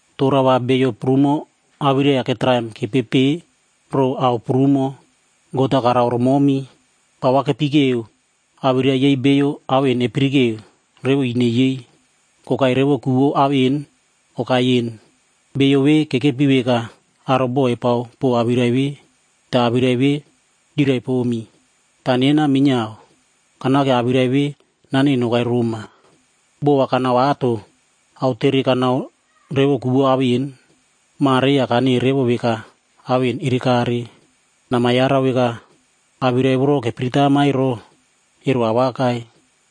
tora va beiyo prumo awirai-ya ketraim kepepe pore ao prumo God-a karao romomi. Pa va kepikeo awirai yei beiyo ao en kepirike revo ine yei, kokai revo ku vou ao en okai en. Beiyo ve kekepi veka aro boꞌo epao pow awirai ve, ta awirai ve kyirai pomi. Ta nena minyiao, kanake awirai ve naneꞌe nokai roma Ma Tiofilus. Boꞌo va kanao ato, aotere kanao revo ku vou ao en. Mare ya kaneꞌe revo veka ao en erekare. Namayarau veka, awirai voro kepiritama ero, ero awakai.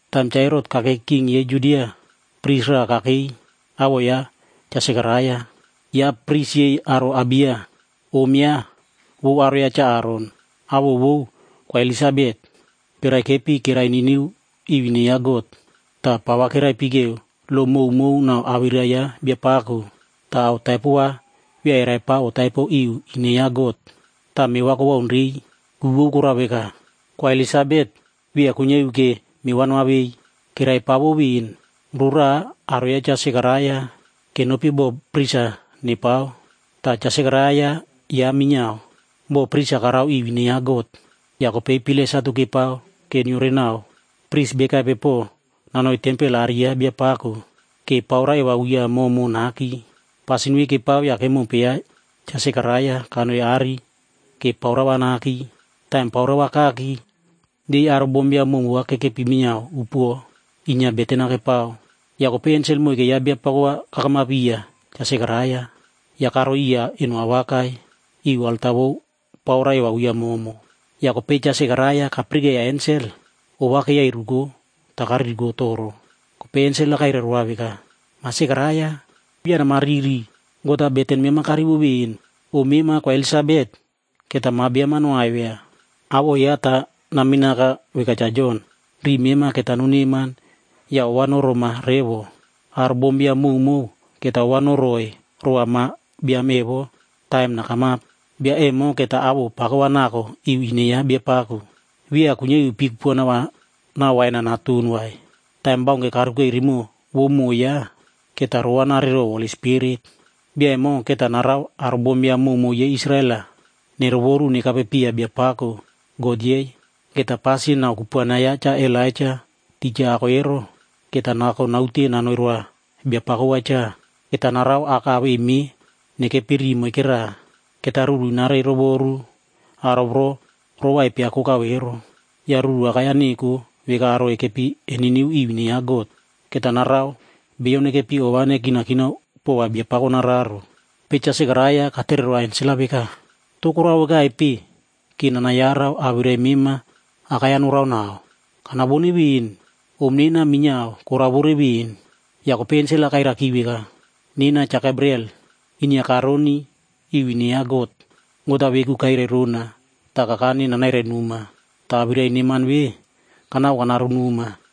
Taim Cha Herot b kakei king yei Judia, pris raꞌa kakei awoꞌo yaꞌa Cha Sekaraia. Yaꞌa pris yei aro Abiya.c Om yaꞌa, vou aro ya Cha Aron,d awoꞌo vou Kwa Elisabet. Keraikepi keraininiu iu ine ya God. Ta pa va keraipikeo lo mowmow nau awirai ya Biapako, ta ao taipo va via eraipao otaipo iu ine ya God. Ta meꞌe va kowaun rei, ku vou korao veka, Kwa Elisabet via kuinyia iu ke meꞌe va noavei. Keraipaovo ven. Roraꞌa aro ya Cha Sekaraia kenopi boꞌo pris-a kepao,e ta Cha Sekaraia yaꞌa minyiao boꞌo pris-a karao iu ine ya God. Ya kopei pilai satu kepao ke nyiorenao pris bekaipe po nanoi tempel aꞌari ya Biapako, ke paura eva uya momo naki. Pasin ve kepao ya kemompe yaꞌa Cha Sekaraia kanoi aꞌari ke paura va naki. Taim paura va kaki, yei aro bombiam mowmow va kekepi minyiao upuo inyia beten-a kepao. Ya kopei ensel moike ya Biapako va kakamap iya Cha Sekaraia, ya karoi iya eno awakai iu alta vou paura eva uya momo. Ya kopei Cha Sekaraia kapirikeiya ensel, ova keiyairuko ta kaririko toro. Kopei ensel-a kairai roa veka, “Ma Sekaraia, via namariri, God-a beten mema karivo ven. Om mema Kwa Elisabet keta ma biam-a noaivia, awoꞌo yaꞌa ta naminaka veka Cha Jon. Riꞌi mema keta noneman ya ova noroma revo. Aro bombiam mowmow keta ova noroꞌoi rova ma biam evo taim nakamap. Bia emo keta awoꞌo pako va nako iu ine ya Biapako. Via kuinyia iu pii kupuana va nau wain-a naton vai. Taim baunke karukei rimoꞌo vou moꞌo yaꞌa, keta rovanare row Holi Spirit. Bia emo keta narao aro bombiam mowmow yei Israel-a nerovoru nekape piya Biapako, God yei. Keta pasin nau kupuana ya Cha Elaija tija ako ero, keta nako naute nanoi roa Biapako va cha. Keta narao aka awei meꞌe nekepi riꞌi moikera. Keta ruru nareirovoru aro voro rova epiakokao ero. Ya ruru awakai-ya neko veka aro ekepi eniniu iu ine ya God. Keta narao beiyo nekepi ova nekinakinao pova Biapako nararo.” Kopei Cha Sekaraia katere roa ensel-a veka, “To korao vekaipe ke nanayarau veka awirai mema awakai-ya noraonao? Kanavone ven. Om nena minyiao koraovore ven.” Ya kopei ensel-a kairaiki veka, “Nena Cha Gebriel, inyia karoni iu ine ya God. God-a veku kairai rona ta kakane nanairai noma, ta awirai neman ve kanako kanaronoma.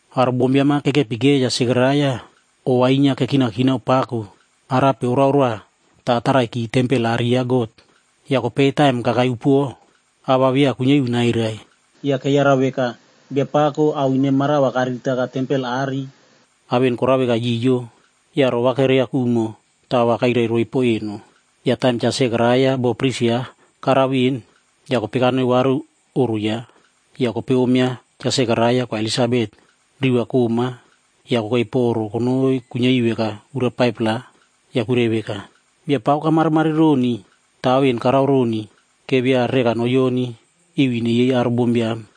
Aro bombiam-a kekepikeiya Cha Sekaraia, inyia ova kekinakinao pako arape orao roa ta ataraiki tempel aꞌari ya God. Ya kopei taim kakai upuo, awirai va via kuinyia iu nairai. Ya keyarau veka Biapako ao ine mara va kariritaka tempel aꞌari, ao en korao veka kayiyo. Ya roꞌo va kereakumo ta awirai-ya kairai roiy po eno. Ya taim Cha Sekaraia boꞌo pris yaꞌa karao ven, ya kopei kanoi varu oꞌro yaꞌa. Ya kopei om ya Cha Sekaraia Kwa Elisabet, ro va koꞌma ya kokei po oꞌro konoi kuinyia iu veka ura 5-pla, ya kuirai veka, “Biapako kamarimari roni ta ao en karao roni ke via reka noyonif iu ine yei aro bombiam.”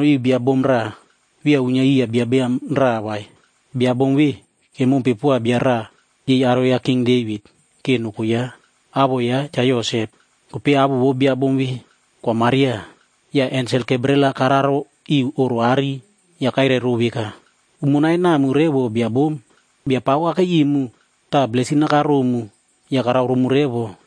Kanoi iu bia bom raꞌa via uinyia iya bia biam raꞌa vai. Bia bom ve kemompe poa bia raꞌa yei aro ya King Devit ke noko yaꞌa. Awoꞌo yaꞌa Cha Yosep. Kopei awoꞌo vou bia bom ve, Kwa Maria. Ya ensel Gebriel-a kararo iu oꞌro aꞌari ya kairai row veka, “Umonai namu revo bia bom. Biapako kakei imu ta blesin-a karomu ya karao romu revo.”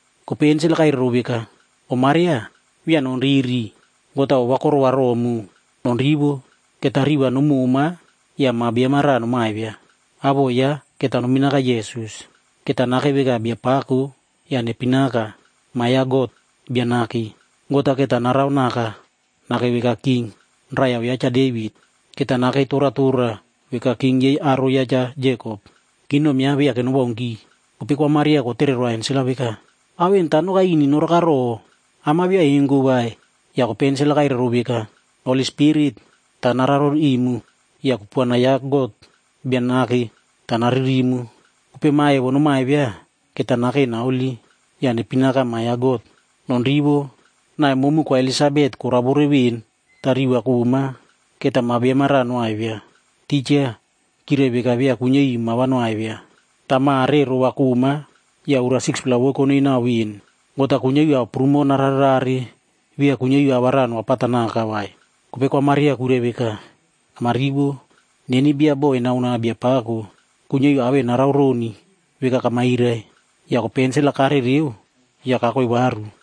Kopei ensel-a kairai row veka, “Om Maria, via nonriri. God-a ova korova romu. Nonrivo, keta rimoꞌo va nomoma ya ma biam-a raꞌa nomaivia. Awoꞌo yaꞌa keta noiminaka Yesus. Keta nakei veka biapako ya neipinaka Ma Biam ya God Bia Nake. God-a keta naraonaka nakei veka king, raiyau ya Cha Devit. Keta nakei toratora veka king yei aro ya Cha Jekop. Kingdom yaꞌa viake nowaunki.” Kopei Kwa Maria kotere roa ensel-a veka, “Ao en ta nokai ini noraka ro? Am-a via engo vai.” Ya kopei ensel-a kairaiki row veka, “Holi Spirit, ta nararo imu ya kupuana ya God Bia Nake ta naririmu. Kopei ma evo nomaivia, keta nakei naholi ya neipinaka Ma Biam ya God. Nonrivo. Naꞌai momu Kwa Elisabet koraovore ven ta rimoꞌo va koꞌma, keta ma biam-a raꞌa noaivia. Tija kyirai veka via kuinyia iu ma va noaivia. Ta mare rimoꞌo koꞌma ya ura 6-pla vou konoi nau ven. God-a kuinyia iu ao prumo nararerare via kuinyia iu ao va raꞌa noapatanaka vai.” Kopei Kwa Maria kuirai veka, “Namarivo. Neni bia boꞌo enao noa Biapako, kuinyia iu ao en narao roni veka kamairai.” Ya kopei ensel-a karereo ya kakoi varu.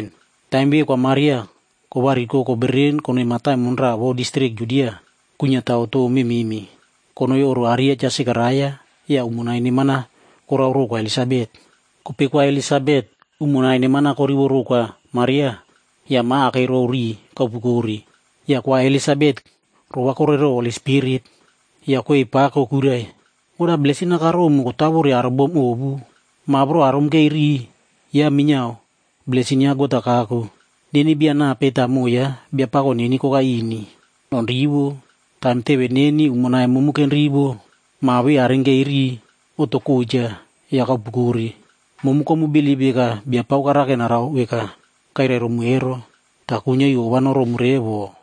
Taim ve Kwa Maria kovariko kobereren konoi mataimon raꞌa vou distrik Judia kuinyia tao tou mememe. Konoi oꞌro aꞌari ya Cha Sekaraia ya umonai neman-a korao row Kwa Elisabet. Kopei Kwa Elisabet umonai neman-a korivo row Kwa Maria ya ma akei row riꞌi kaupukore. Ya Kwa Elisabet rovakore row Holi Spirit. Ya kwei pako kuirai, “God-a blesin-a karomu kotawore aro bom ovu. Ma voro arumkei riꞌi, yaꞌa minyiao blesin ya God-a kako. Neni bia nape ta moꞌo ya Biapako neni kokai ini? Nonrivo. Taim teve neni umonai momu kenrivo, ma ve arinkei riꞌi, oꞌto kocha ya kaupukore. Momu komubilip veka Biapako karake narao veka kairai romu ero, ta kuinyia iu ova noromu revo.”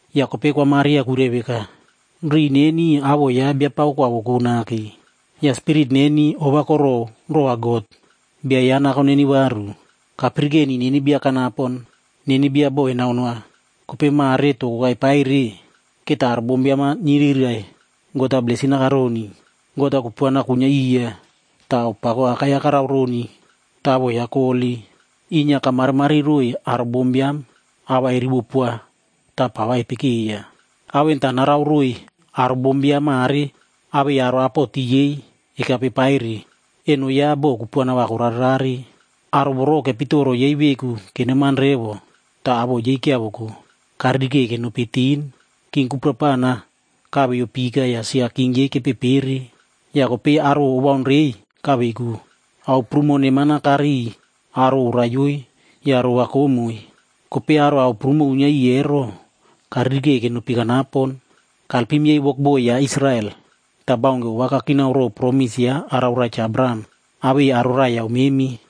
Ya kopei Kwa Maria kuirai veka: “Riꞌi neni awoꞌo ya Biapako koavoko nake. Ya spirit neni ova korow rova God, Bia yaꞌa nako neni varu. Kapirikeni neni bia kanapon, neni bia boꞌo enao noa. Kopei mare to kokai paire, keta aro bombiam-a nyirirai God-a blesin-a karoni. God-a kupuana kuinyia iya, ta ao pako awakai-ya karao roni ta awoꞌo yaꞌa koholi. Inyia kamarimari roiy aro bombiam awirai-ya erivo poa ta pa va epikeiya. Ao en ta narao roiy aro bombiam mare awei aro apoti ekape paire. Eno yaꞌa boꞌo kupuana va korarerare. Aro voro kepitoro yei veku keneman revo ta awoꞌo yei kyiavoko, karirikei kenopi tin. King kuprapana kaveiyo pika ya sia king yei kepepere, ya kopei aro awoꞌo owaun rei kaveiko. Ao prumo neman-a inyia kariy aro oraiyoe ya ro va koꞌmoi. Kopei aro ao prumo uinyia iꞌiy ero, karirikei kenopi kanapon. Kalpim yei wokboi yaꞌa Israel, ta baunke ova kakinao row promis yaꞌa arao roa Cha Abraham awei aro raiyau memi,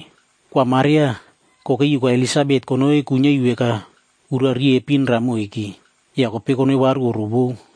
Kwa Maria kokei iu Kwa Elisabet konoi kuinyia iu veka ura riepin raꞌa moike, ya kopei konoi varu oꞌro vou.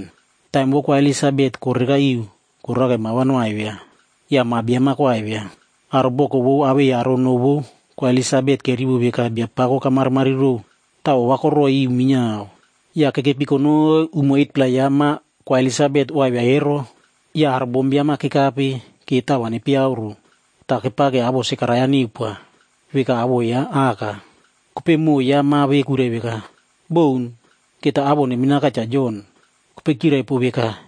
Taim vou Kwa Elisabet korereka iu korake ma va noaivia ya ma biam-a koaivia. Aro boko vou awei aro noꞌo vou Kwa Elisabet kerivo veka Biapako kamarimari row, ta ova koroꞌoi iu minyiao. Ya kekepi konoi umo 8-pla ya ma Kwa Elisabet oaivia ero, ya aro bombiam-a kekape ke tao va nepeiyauro. Ta kepake awoꞌo Sekaraia neupoa, veka awoꞌo ya aka. Kopei moꞌo ya ma ve kuirai veka, “Boun. Keta awoꞌo neiminaka Cha Jon.” Kopei kyirai pow veka,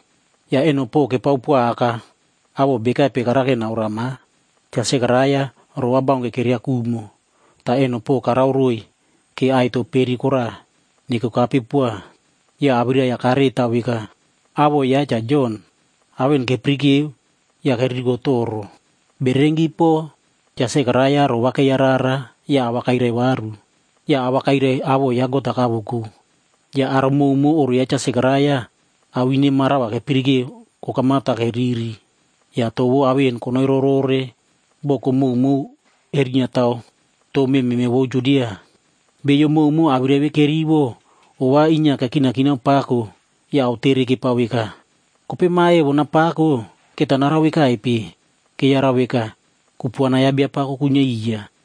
Ya eno po kepao poa aka awoꞌo bekaipe karake naoroa ma. Cha Sekaraia roꞌo va baunke kereakumo, ta eno po karao roiy ke aꞌai to peri koraꞌa nekokape poa. Ya awirai-ya kareꞌe tao veka, “Awoꞌo ya Cha Jon.” Ao en kepirikeo ya keririko toro. Bererenki po Cha Sekaraia rovakeiya rara ya awirai-ya kairai varu. Ya a va kairai awoꞌo ya God-a kavoko. Ya aro mowmow oꞌro ya Cha Sekaraia ao ine mara va kepirikeo kokamap ta keriri. Ya awirai vou ao en konoi rorore boko mowmow erinyia tao tou mememe vou Judia. Beiyo mowmow awirai ve kerivo, inyia ova kekinakinao pako ya aotere kepao veka, “Kopei ma evo napako keta narao vekaipe” Keyarau veka, kupuana ya Biapako kuinyia iya.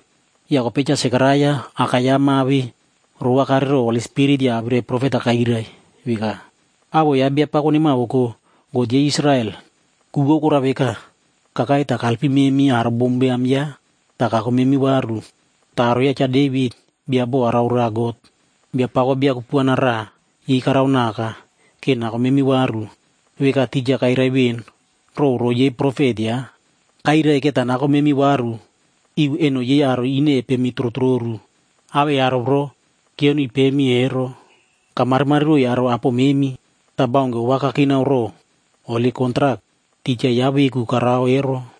Ya kopei Cha Sekaraia, aka ya ma ve rovakare row Holi Spirit ya awirai profet-a kairai veka, “Awoꞌo ya Biapako nemavoko, God yei Israel. Ku vou korao veka, kakai ta kalpim memi aro bombiam yaꞌa ta kako memi varu. Ta aro ya Cha Devit bia boꞌo arao roa God, Biapako bia kupuana raꞌa yei karaonaka ke nako memi varu, veka tija kairai ven row roꞌo yei holi profet yaꞌa. Kairai keta nako memi varu iu eno yei aro ine epemi torotororu awei aro voro kyioniy pemi revo ero. Kamarimari roiy aro apo memi, ta baunke ova kakinao row holi kontrak tija yaꞌa veku karao ero.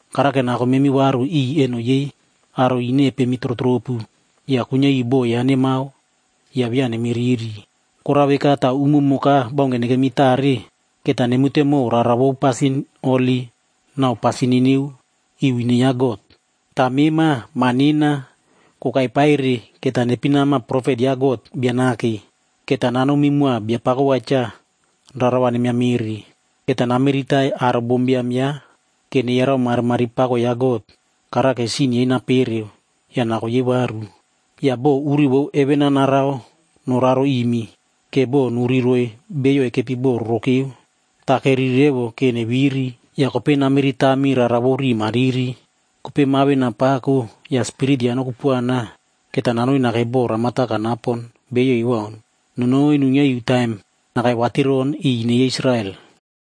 Karake nako memi varu iꞌiy eno yei aro ine epemi torotoropu, ya kuinyia iu boꞌo yaꞌa nemao ya via nemiriri. Korao veka ta umumo baunke nekemi tare, keta nemute mow rara vou pasin holi nau pasin niniu iu ine ya God. Ta mema, ma nena, kokai pa ere keta neipinama profet ya God Bia Nake. Keta nanomi moa Biapako va cha rara va nemiamere. Keta namiritai aro bombiam yaꞌa, ke neyarau marimari pako ya God. Karake sin yei napereoki ya nako yei varu. Ya bo uri vou heven-a narao noraro imi, ke bo nuri roiy beiyo ekepi bo rorokeu ta keriri revo ke neviri, ya kopei nariritami rara vou riꞌi mariri.” Kopei ma ve napako ya spirit ya nokupuana, keta nanoi nakei bo ramata kanapon beiyo ewaun nonoi nuinyia iu taim nakai vatiron iꞌiy ine yei Israel.